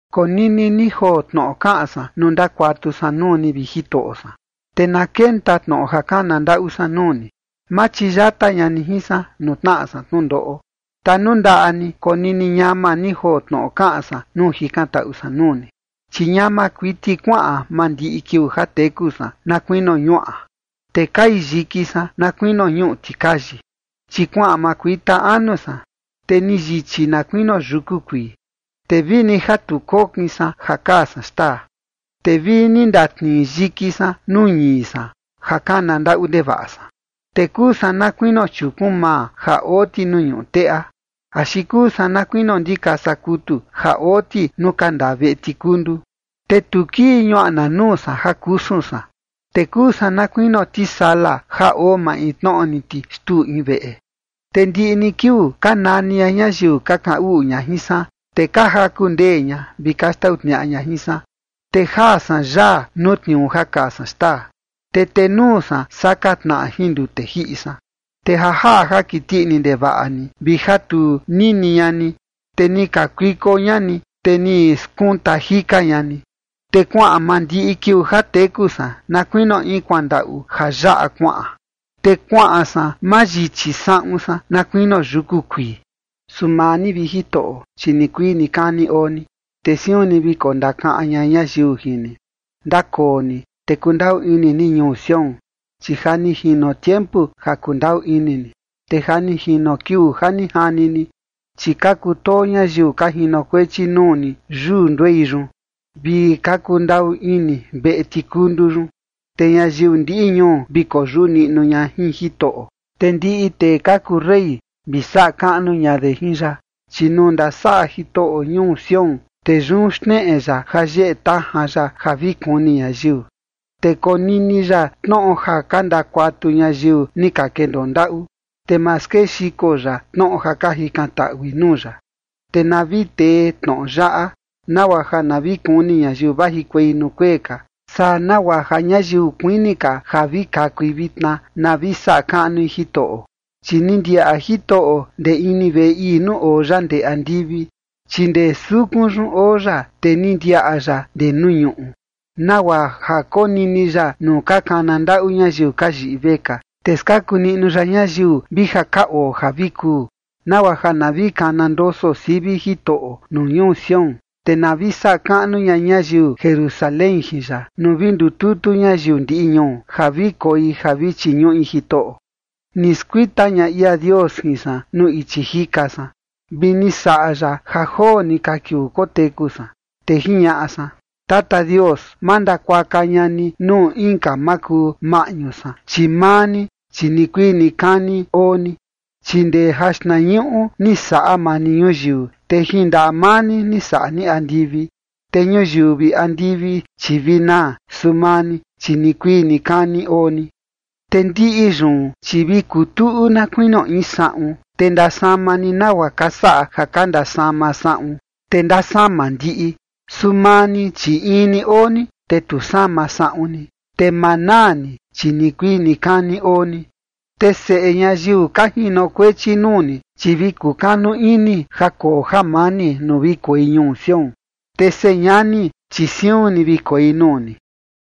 Konini ni joo tnoꞌo kaꞌan san nuu ndakuatu san nuu ni, vi Jitoꞌo san, te na kenta tnoꞌo ja kana ndaꞌu san nuu ni. Ma chiyata ña ni jin san nuu tnaꞌa san tnundoꞌo. Tanundaꞌa ni konini ñama ni joo tnoꞌo kaꞌan san nuu jikantaꞌu san nuu ni. Chi ñama kuiti kuaꞌan mandiꞌi kiuu ja teku san na kuinio ñuaꞌa, te kai yiki san na kuinio ñuꞌu tikayi. Chi kuaꞌan ma kuita anu san, te ni yichi na kuinio yuku kuii, te vini ja tu kokin san ja kaa san xtaa. Te vini ndatnii yiki san nuu ñii san ja kana ndaꞌu ndevaꞌa san. Te kuu san na kuinio chiukun maa ja oo ti nuu ñuꞌu teꞌa, axi kuu san na kuinio ndikasa kutu ja oo ti nuu ka ndaa veꞌe tikundu. Te tu kii ñuaꞌna nuu san ja kusun san, te kuu san na kuinio tisala ja oo maintnoꞌo ni ti xtuu in veꞌe. Te ndiꞌi ni kiuu ka nani ña ñayiu ka kaꞌan uꞌu ña jin san, te ka jaku ndee ña vi ka xtau tniaꞌa ña jin san. Te jaa san yaa nuu tniuu ja kaa san xtaa, te tenuu san saka tnaꞌa jin ndute jiꞌi san. Te ja jaꞌa ja kiti ini ndevaꞌa ni vi ja tu nini ña ni, te ni kakuiko ña ni, te ni skunta jika ña ni. Te kuaꞌan mandiꞌi kiuu ja teku san na kuinio in kuandaꞌu ja yaꞌa kuaꞌan, te kuaꞌan san mayichi saꞌun san na kuinio yuku kuii. Su maa ni, vi Jitoꞌo, chi nikuii nikani oo ni, te siun ni vi kondakaꞌan ña ñayiu jin ni. Ndakoo ni, te kundaꞌu ini ni ñuu Sión, chi ja ni jino tiempu ja kundaꞌu ini ni, te ja ni jino kiuu ja ni jani ni. Chi ka kutoo ñayiu ka jinokuechi nuu ni yuu nduei yun, vi ka kundaꞌu ini veꞌe tikundu yun. Te ñayiu ndiꞌi ñuu vi koyuꞌu niꞌnu ña jin Jitoꞌo, te ndiꞌi tee ka kuu rey vi saꞌa kaꞌnu ña de jin ya. Chi nuu ndasaꞌa Jitoꞌo ñuu Sión, te yun xneꞌe ya ja yeꞌe tajan ya ja vi kuni ñayiu. Te konini ya tnoꞌo ja ka ndakuatu ñayiu ni ka kendoo ndaꞌu, te ma skexiko ya tnoꞌo ja ka jikantaꞌui nuu ya. Te na vi tee tnoꞌo yaꞌa, nagua ja na vi kuni ñayiu vajikuei nuu kuee ka, saa nagua ja ñayiu kuini ka ja vi kakui vitna, na vi saꞌa kaꞌnui Jitoꞌo. Chi ni ndiaꞌa Jitoꞌo ndee ini veꞌe ii nuu oo ya ndee andivi, chi ndee sukun yun oo ya, te ni ndiaꞌa ya ndee nuu ñuꞌu, nagua ja konini ya nuu ka kana ndaꞌu ñayiu ka yiꞌi vekaa, te skaku niꞌnu ya ñayiu vi ja ka oo ja vi kuu, nagua ja na vi kana ndoso sivi Jitoꞌo nuu ñuu Sión, te na vi saꞌa kaꞌnu ña ñayiu Jerusalén jin ya, nuu vi ndututu ñayiu ndiꞌi ñuu, ja vi koi ja vi chiñuꞌi Jitoꞌo. Ni skuita ña ia Dios jin san nuu ichi jika san, vi ni saꞌa ya ja joo ni ka kiuu koteku san. Te jiñaꞌa san: “Tata Dios, ma ndakuaka ña ni nuu inka makuu maꞌñu san, chi maa ni, chi nikuii nikani oo ni. Chi ndee jaxtnañuꞌu ni saꞌa maa ni ñuyiu, te jin ndaꞌa maa ni ni saꞌa ni andivi. Te ñuyiu vi andivi, chi vi naa, su maa ni, chi nikuii nikani oo ni, te ndiꞌi yun, chi vi kutuꞌu na kuinio in saꞌun, te ndasama ni nagua ka saꞌa ja ka ndasama saꞌun, te ndasama ndiꞌi. Su maa ni, chi in ni oo ni, te tu sama saꞌun ni, te ma naa ni, chi nikuii nikani oo ni. Te seꞌe ñayiu ka jinokuechi nuu ni, chi vi kukanu ini ja koo jamani nuu vi koi ñuu Sión, te señani, chi siun ni vi koi nuu ni.”